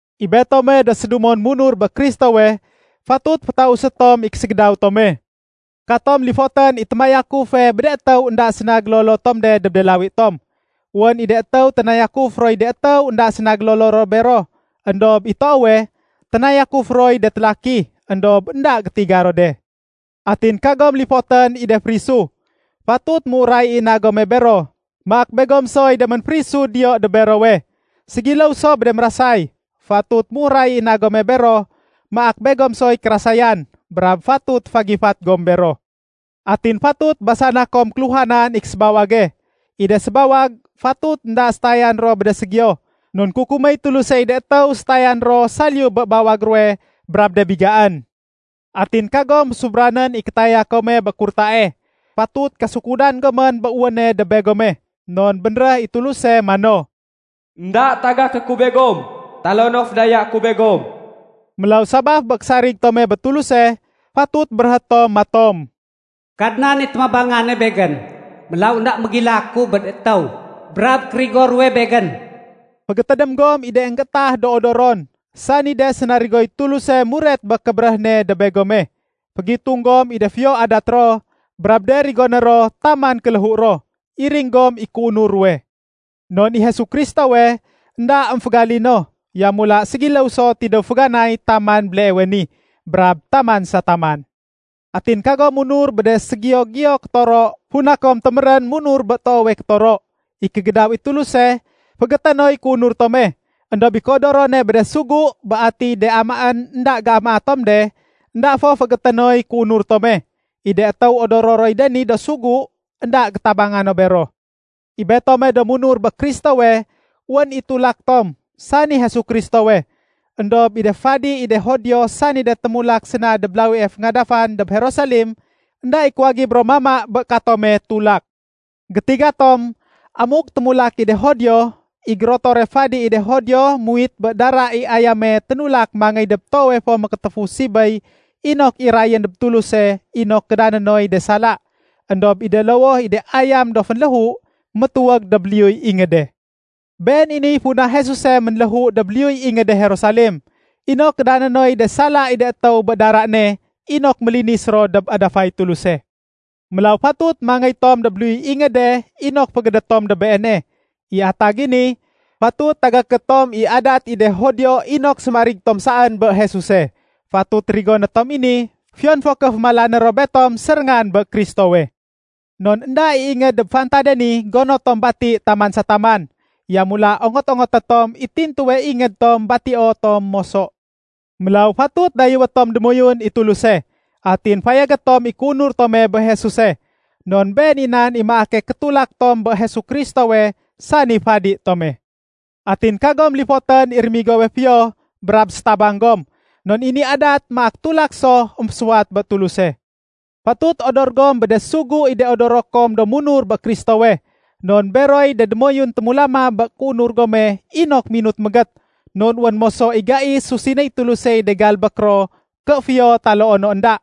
I betome do sédumon munur bé Kristowe, fatut fétausé tom i késégédaw tome. Katom lifotén i témayakufe bé de étéw énda séna gélolo tom de dob de lawi tom. Wén i de étéw ténayakuf roy de étéw énda séna gélolo ro bero, éndob i toowe, ténayakuf roy de télaki, éndob énda gétiga ro de. Atin kagom lifotén i de férisu. Fatut méuray i na gome bero maak begom soy de ménférisu diyo dob berowe. Ségiléw so bé de mérasay, fatut méuray i na gome bero maak begom soy kérasayan, brab fatut fagifat gom bero. Atin fatut basana kom kéluhanan i késébawage. I de sébawag fatut énda sétayan ro bé de ségiyo. Non kukuméy Tulusey de étéw sétayan ro saliyu bé bawag ruwe brab de bigaén. Atin kagom fésubranén i kétaya kome bé kurtae. Fatut kasukudan gomén bé wéne dob begome. Non bénréh i Tuluse mano, “Enda tagaké ku begom, taloo no fédayaé ku begom.” Mélaw sabaf bé késarig tome bé Tuluse, fatut béréhé tom matom, “Kadnan i témabangane begén. Mélaw énda mégilaku bé de étéw brab kérigo ruwe begén.” Fégétédém gom i de énggéétah do odoron, sani de sénarigoy Tuluse muret bé kébéréh ne dob begome. Fégitung gom i de fiyo adat ro brab de rigoné ro taman kéléhu ro. Iring gom i kéunur ruwe. Non i Jesu Kristowe, énda émfégalino. Yamula ségiléw so tidéw féganay taman béleewe ni, brab taman sa taman. Atin kagom munur bé de ségiyo-giyo kétoro funa kom témérén munur bé toowe kétoro. I kégédaw i Tuluse féégété noy kéunur tome. Endob i kéodorone bé de sugu bé atiy de amaén énda géamaa tom de, énda fo féégété noy kéunur tome. I de étéw odoro roy de ni do sugu, énda gétabanga no bero. I betome do munur bé Kristowe, wén i tulak tom, sani Jesu Kristowe. Endob i de fadi i de Judio, sani de témulak séna dob lawie féngadafan dob Jerusalem, énda i kuwagib ro mama bé katome tulak. Gétiga tom amuk témulak i de Judio, i gérotore fadi i de Judio, muwit bé dara i ayame ténulak mangéy dob Toowe fo Mékétéfu Sibéy inok irayén dob Tuluse inok kédané noy de sala. Endob i de lowoh i de ayam do fénléhu, métuwég dob liyuy ingéde. Been i niy funa Jesuse ménléhu dob liyuy ingéde Jerusalem, inok kédané noy de sala i de étéw bé dara ne inok mélinis ro dob adafay Tuluse. Mélaw fatut mangéy tom dob liyuy ingéde inok géfégédét tom dob Beene. I atag i ni, fatut tagaké tom i adat i de Judio inok sémarig tom saén bé Jesuse. Fatut rigoné tom i ni fiyon fo ké fémalané ro betom séréngan bé Kristowe. Non énda i ingéd dob fantade ni gono tom bati taman sa taman. Yamula ongot-ongoté tom i tintuwe ingéd tom batio tom moso. Mélaw fatut dayéwé tom démoyun i Tuluse, atin fayagé tom i kéunur tome bé Jesuse. Non been i nan i maake kétulak tom bé Jesu Kristowe, sani fadi tome. Atin kagom lifotén i rémigowe fiyo brab sétabang gom, non i ni adat maak tulak so émfésuwat bé Tuluse. Fatut odor gom bé de sugu i de odoro kom do munur bé Kristowe. Non beroy de démoyun témulama bé kéunur gome inok minut mégét. Non wén moso i gai susinéy Tulusey de galbék ro ké fiyo taloo no énda.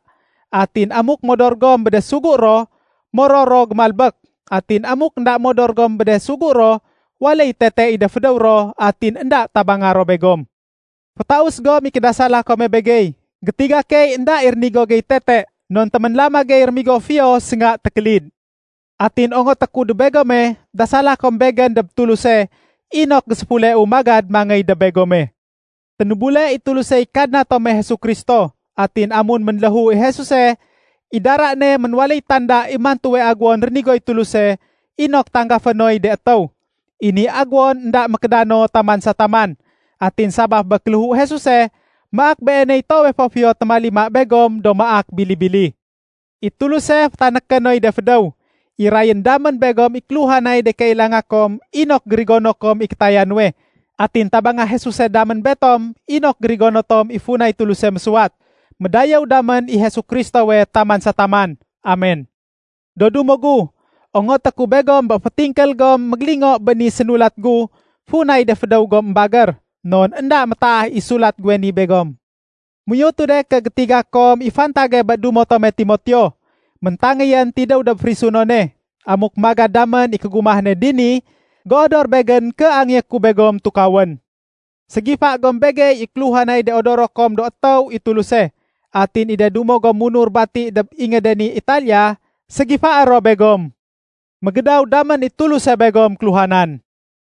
Atin amuk modor gom bé de sugu ro, moror ro gémalbék. Atin amuk énda modor gom bé de sugu ro, waléy tete i de fédéw ro atin énda tabanga ro begom. Fétaus gom i kédasala kome begey. Gétiga key énda i rénigo gey tete non téménlama gey rémigo fiyo sénga tékélid. Atin ongoté ku dob begome dasala kom begén dob Tuluse inok géséfuleu magad mangéy dob begome. Ténébule i Tulusey Kadna tome Jesu Kristo. Atin amun ménléhu i Jesuse, i dara ne ménwaléy tanda i mantuwe aguwon rénigoy Tuluse inok tanggafé noy de étéw. I ni aguwon énda mékédano taman sa taman. Atin sabaf bé kéléhu Jesuse maak Beeney toowe fo fiyo témalima begom do maak bili-bili. I Tuluse fétanéké noy de fédéw, irayén damén begom i kéluhanay de kailanga kom inok gérigono kom i kétaya nuwe. Atin tabanga Jesuse damén betom inok gérigono tom i funay Tuluse mésuwat. Médayéw damén i Jesu Kristowe taman sa taman. Amen! Do dumo gu, ongoté ku begom bé fétingkél gom mégélingo bé ni sénulat gu funay de fédéw gom émbagér. Non énda métaah i sulat guwe ni begom. Méuyotu de ké gétiga kom i fantage bé dumo tome Timoteo. Méntangéyén tidéw dob férisunone. Amuk magad damén i kégumah ne dini, géodor begén ké angéyé ku begom tukawén. Ségifa gom begey i kéluhanay de odoro kom do étéw i Tuluse. Atin i de dumo gom munur bati dob ingéde ni Italiya, ségifaé ro begom. Mégédaw damén i Tuluse begom kéluhanan.